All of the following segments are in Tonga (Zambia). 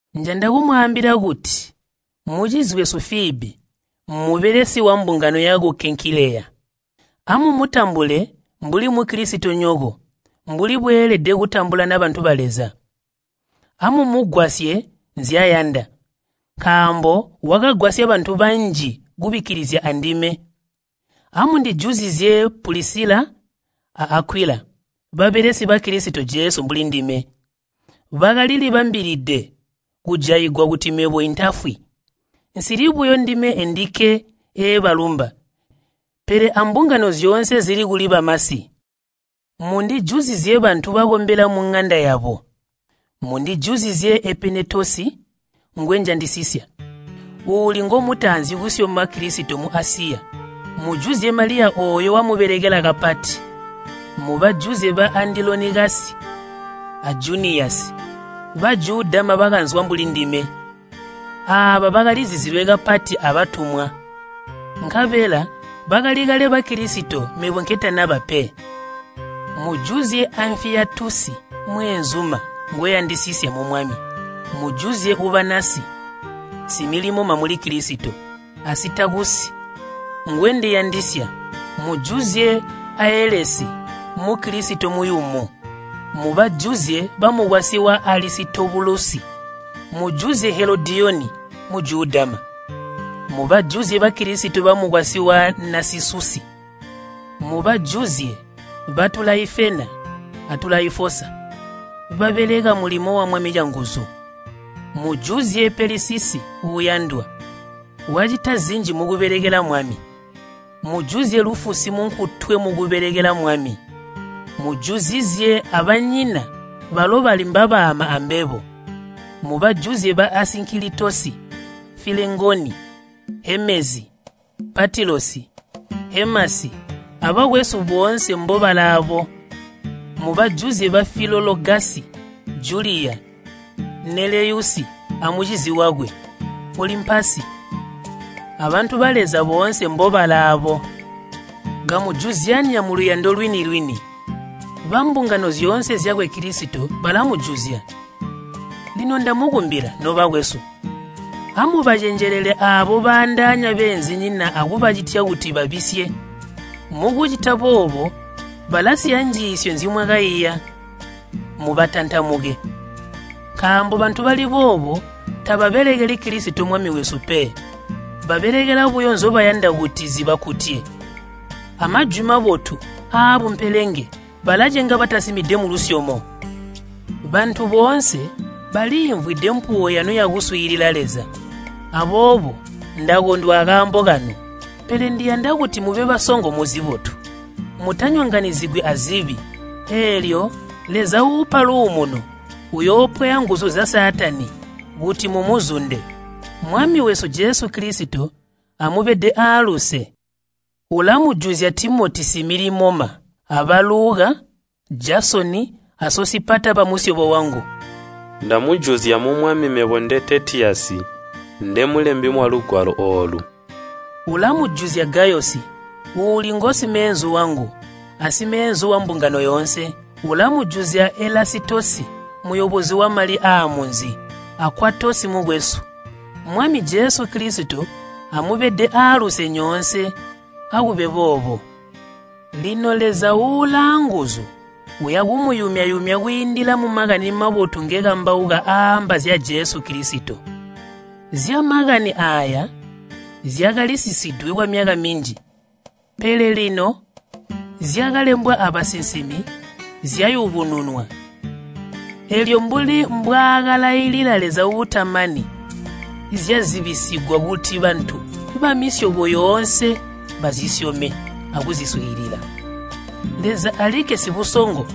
Njanda kumwaambila kuti mucizi wesu Fiibi, mmubelesi wambungano yaku Kenkileya. Amumutambule mbuli Mukilisitonyoko mbuli bweelede kutambulana bantu ba Leza. Amumugwasye nzyayanda, nkaambo wakagwasya bantu banji kubikkilizya andime. Amundijuzizye Pulisila a Akwila, babelesi ba Kilisito Jesu mbuli ndime. Bakalilibambilide kujaigwa kuti mebo intafwi. Nsili buyo ndime endikke eebalumba, pele ambungano zyoonse zili kuli bamasi. Mundijuzizye bantu bakombela muŋanda yabo. Mundijuzizye Epenetosi ngwenjandisisya, uuli ngomutaanzi kusyoma Kilisito mu Asiya. Mujuzye Maliya ooyo wamubelekela kapati. Mubajuzye ba Andilonikasi a Juniyasi, Bajudama bakanzwa mbuli ndime. Aaba bakalizizilwe kapati abatumwa, nkabela bakali kale Bakilisito mebo nketanaba pe. Mujuzye Amfipolosi mweenzuma ngwendiyandisisya mu Mwami. Mujuzye Ubanasi, similimoma muli Kilisito, a Sitakusi, ngwendiyandisya. Mujuzye Aelesi, Mukilisito muyumu. Mubajuzye bamukwasyi wa Alisitobulusi. Mujuzye Helodiyoni, Mujudama. Mubajuzye Bakilisito bamukwasyi wa Nasisusi. Mubajuzye ba Tulaifena a Tulaifosa, babeleka mulimo wa Mwami canguzu. Mujuzye Pelisisi uuyandwa, wacita zinji mukubelekela Mwami. Mujuzye Lufusi munkutwe mukubelekela Mwami, mujuzuzizye abanyina balo bali mbabaama ambebo. Mubajuzye ba Asinkilitosi, Filengoni, Hemezi, Patilosi, Hemasi, abakwesu boonse mbobalaabo. Mubajuzye ba Filologasi, Juliya, Neleyusi amucizi wakwe, Olimpasi, abantu ba Leza boonse mbobalaabo. Kamujuzyanya muluyando lwini-lwini. Bambungano zyoonse zyakwe Kilisito balamujuzya. Lino ndamukumbila, nobakwesu, amubacenjelele aabo baandaanya beenzinyina akubacitya kuti babisye. Mukucita boobo balasiya njiisyo nzimwakaiya. Mubatantamuke, nkambo bantu bali boobo tababelekeli Kilisito Mwami wesu pe. Babelekela buyo nzobayanda kuti zibakkutye. Amajwi mabotu aabumpelenge balacenga batasimide mulusyomo. Bantu boonse baliimvwide mpuwo yanu yakuswiilila Leza. Aboobo ndakondwa akaambo kanu, pele ndiyanda kuti mube basongo muzibotu, mutanyonganyizigwi azibi. Eelyo Leza uupa luumuno, uyoopwaya nguzu zya Saatani kuti mumuzunde. Mwami wesu Jesu Kilisito amubede aaluse. Ulamujuzya Timoti similimoma, aba Luka, Jasoni a Sosipata bamusyobo wangu. Ndamujuzya mu Mwami mebo nde Teetiyasi, ndemulembi walugwalo oolu. Ulamujuzya Gayosi, uuli ngosimeenzu wangu asimeenzu wambungano yoonse. Ulamujuzya Elasitosi muyobozi wamali aamunzi, a Kwatosi mukwesu. [ Mwami Jesu Kilisito amubede aaluse nyoonse. Akube boobo.] Lino Leza ulaanguzu uya kumuyumya-yumya kwiindila mu Makani Mabotu ngekambauka aaamba zya Jesu Kilisito. Zya Makani aaya zyakalisisidwe kwamyaka minji pele lino zyakalembwa abasinsimi zyayubununwa, eelyo mbuli mbwaakalailila Leza uutamani zyazibisigwa kuti bantu bamisyobo yoonse bazisyome akuziswiilila. Leza alikke sibusongo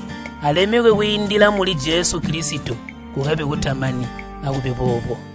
alemekwe kwiindila muli Jesu Kilisito kukabe kutamani. Akube boobo.